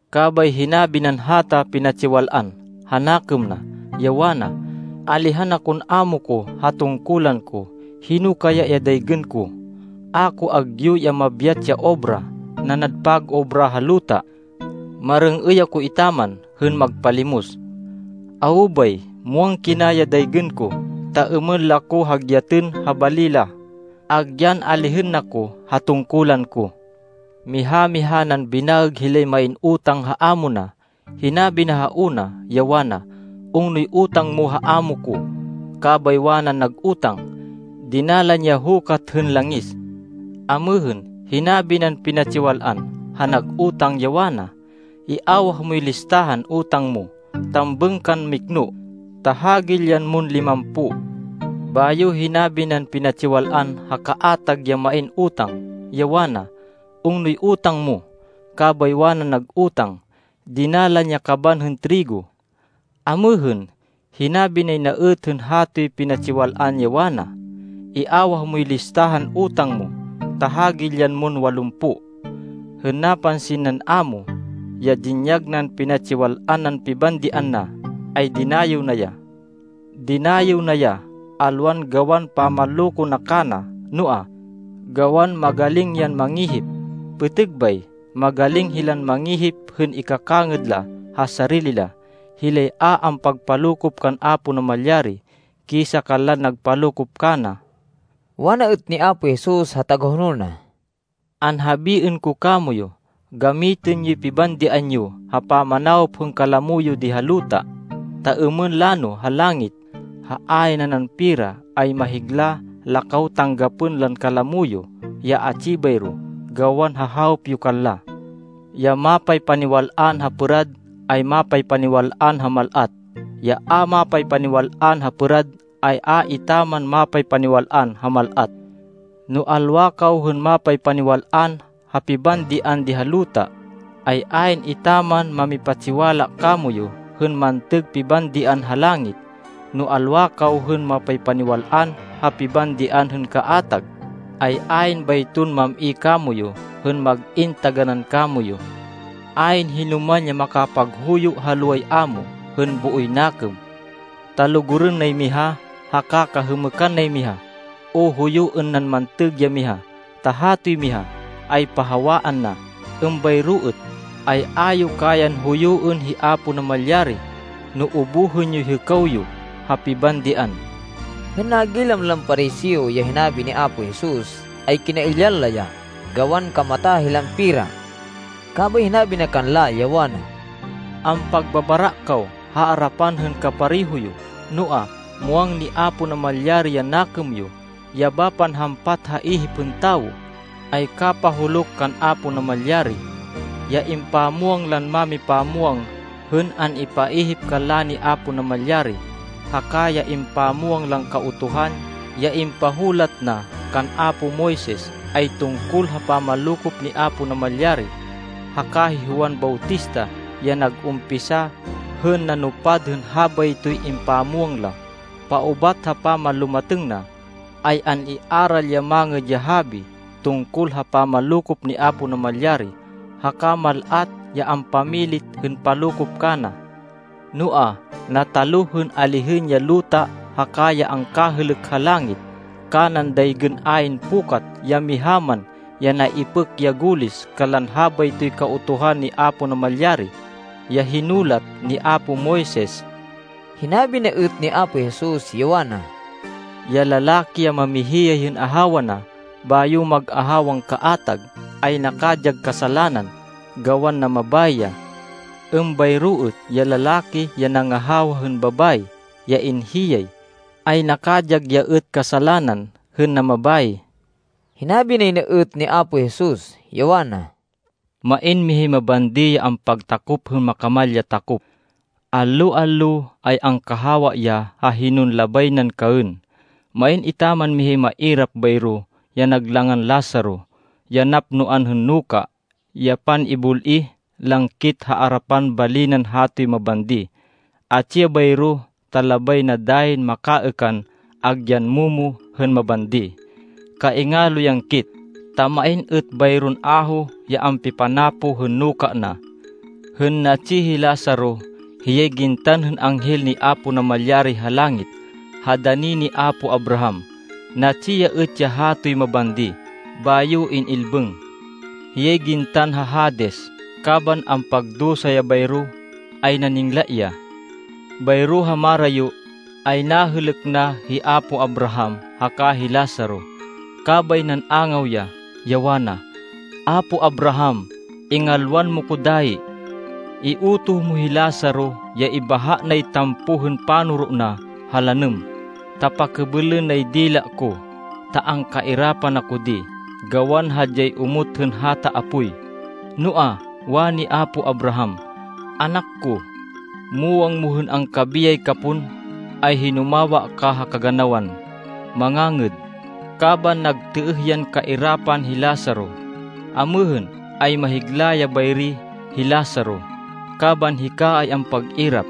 Kabay hinabi nan hata pinatsiwal-an ha nakêm na, ya wana, ‘Alihan akon ámo ko ha tungkulan ko. Hino kaya ya daygên ko? A ko agyu ya mabyat ya obra, nanad pag-obra ha luta. Marêng-êy ako etaman hên magpalimos. Awo bay, muwang kina ya daygên ko, ta êmên la ko hagyatên ha bali la, agyan alihên na ko ha tungkulan ko.’ “Miha-miha nan binaêg hilay main utang ha amo na. Hinabi na ha una, ya wana, ‘Ungnoy utang mo ha amo ko?’ Kabay wanan nag utang, ‘Dinalan ya hukat hên langis.’ Amêhên, hinabi nan pinatsiwal-an ha nag utang, ya wana, ‘Iawah moy listahan utang mo. Tambêng kan mikno, ta hagilyan mon limampo.’ Bayo hinabi nan pinatsiwal-an ha kaatag ya main utang, ya wana, ‘Ungnoy utang mo?’ Kabay wanan nag utang, ‘Dinalan ya kaban hên trigo.’ Amêhên, hinabi nay na êt hên hatoy pinatsiwal-an, ya wana, ‘Iawah moy listahan utang mo, ta hagilyan mon walumpo.’ Hên napansin nan amo ya dinyag nan pinatsiwal-an nan pibandian na, ay dinayêw na ya. Dinayêw na ya, alwan gawan pamanloko na kana, noa, gawan magaling yan mangihip. Pêtêg bay magaling hilan mangihip hên ikakangêd la ha sarili la, hilay a ampagpalokop kan Apo Namalyari, kisa kanlan nagpalokop kana.” Wana êt ni Apo Jesus ha tagahonol na, “Anhabiên ko kamoyu, gamitên yoy pibandian yo ha pamanawop hên kalamo yo di ha luta, ta êmên lano ha langit, ha ayn nanan pera, ay mahigla la kaw tanggapên lan kalamo yo ya atsi bayro gawan ha hawop yo kanla. Ya mapaypaniwal-an ha pêrad, ay mapaypaniwal-an ha mal-at. Ya a mapaypaniwal-an ha pêrad, ay a etaman mapaypaniwal-an ha mal-at. No alwa kaw hên mapaypaniwal-an ha pibandian di ha luta, ay ayn etaman mamipatsiwala kamoyu hên mantêg pibandian ha langit. No alwa kaw hên mapaypaniwal-an ha pibandian hên kaatag, ay ayn bayton mam-i kamoyu, hên mag-in taganán kamoyu. “Ayn hinoman ya makapaghuyo ha loway amo hên booy nakêm. Ta lugurên nay miha, haka kahêmêkan nay miha, o huyuên nan mantêg ya miha, ta hatoy miha, ay pahawaan na. Êmbayro êt, ay a yo kayan huyuên hi Apo Namalyari no ubuhên yoy hêkaw yo ha pibandian.” Hên nagilam lan Pariseo ya hinabi ni Apo Jesus, ay kinailyan la ya gawan kamata hilan pera. Kabay hinabi na kanla, ya wana, “Ampagbabara kaw ha arapan hên kapareho yo, noa, muwang ni Apo Namalyari ya nakêm yo. Ya bapan hampat ha ihip hên tawo, ay kapahuluk kan Apo Namalyari. “Ya impamwang lan mámipamwang hên an-ipaihip kanla ni Apo Namalyari, haka ya impamwang lan Kautuhan ya impahulat na kan apo Moises, ay tungkol ha pamanlokop ni Apo Namalyari. Haka hi Juan Bautista ya nag-umpisa hên nanupad hên habaytoy impamwang la. Paubat ha pamanlumatêng na, ay an-iaral ya Mangêd ya Habi tungkol ha pamanlokop ni Apo Namalyari haka mal-at ya ampamilit hên palokop kana. Noa, nataluh hên alihên ya luta haka ya angkahêlêk ha langit kanan daygên ayn pukat ya miha man ya naipêk ya gulis kanlan habaytoy Kautuhan ni Apo Namalyari, ya hinulat ni apo Moises.” Hinabi na êt ni Apo Jesus, ya wana, “Ya lalaki ya mamihiyay hên ahawa na, bayo mag-ahawan kaatag, ay nakadyag kasalanan gawan namabayi ya. Êmbayro êt ya lalaki ya nangahawa hên babayi ya inhiyay, ay nakadyag ya êt kasalanan hên namabayi.” Hinabi nay na êt ni Apo Jesus, ya wana, “Main mihay mabandi ya ampagtakop hên makamal ya takop. Allo-allo, ay angkahawa ya ha hinon labay nan kaên. Main etaman mihay mairap bayro ya nag langan Lazaro ya napnoan hên nuka, ya pan-ibul-ih lan kit ha arapan bali nan hatoy mabandi. Atsi ya bayro, ta labay na dayin makaêkan agyan momo hên mabandi. Kaingalo yan kit, ta main êt bayron aho ya ampipanapoh hên nuka na. Hên natsi hi Lazaro, hiyay gintan hên anghel ni Apo Namalyari ha langit, ha dani ni apo Abraham. Natsi ya êt ya hatoy mabandi, bayo in-ilbêng. “Hiyay gintan ha Hades. Kaban ampagdusa ya bayro ay naningla ya. Bayro ha marayo, ay nahêlêk na hi apo Abraham haka hi Lazaro. Kabay nan-angaw ya, ya wana, ‘Apo Abraham, ingalwan mo ko dayi. Iutoh mo hi Lazaro ya ibahá nay tampoh hên panoro na ha lanêm, ta pakêbêlên nay dila ko, ta angkairapan ako di, gawan hadyay omot hên hata apoy.’ Noa, wani apo Abraham, ‘Anak ko, muwang mo hên angkabiyay ka pon, ay hinumawa ka ha kaganawan mangangêd, kaban nagtêêh yan kairapan hi Lazaro. Amêhên, ay mahigla ya bayri hi Lazaro, kaban hika ay ampag-irap.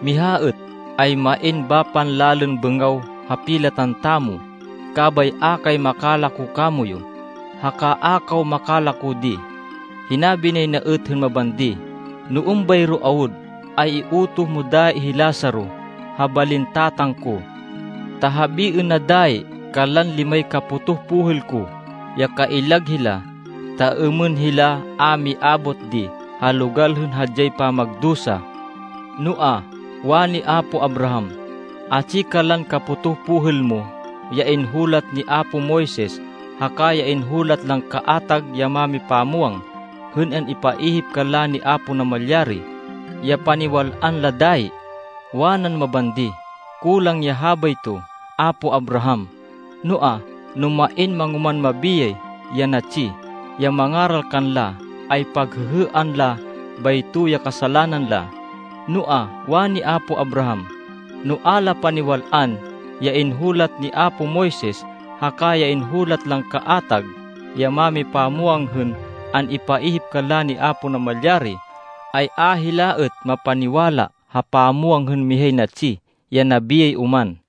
Miha êt, ay main bapan lalên bêngaw ha pilatan tamo. Kabay a kay makalako kamoyu, haka a kaw makalako di.’ “Hinabi nay na êt hên mabandi, ‘No êmbayro awud, ay iutoh mo dayi hi Lazaro ha balin tatang ko. Ta habiên na dayi kanlan limay kapotoh pohêl ko ya kaillag hila, ta êmên hila a miabot di ha logal hên hadyay pamagdusa.’ Noa, wani apo Abraham, ‘Atsi kanlan kapotoh pohêl mo ya inhulat ni apo Moises haka ya inhulat lan kaatag ya mámipamwang hên an-ipaihip kanla ni Apo Namalyari ya paniwal-an la dayi.’ Wanan mabandi, ‘Kulang ya habayto apo Abraham. Noa, no main mangoman mabiyay ya natsi, ya mangaral kanla, ay paghêhêan la bayto ya kasalanan la.’ Noa, wani apo Abraham, ‘No a la paniwal-an ya inhulat ni apo Moises, haka ya inhulat lan kaatag ya mámipamwang hên an-ipaihip kanla ni Apo Namalyari, ay a hila êt mapaniwala ha pamwang hên mihay natsi, ya nabiyay oman.’”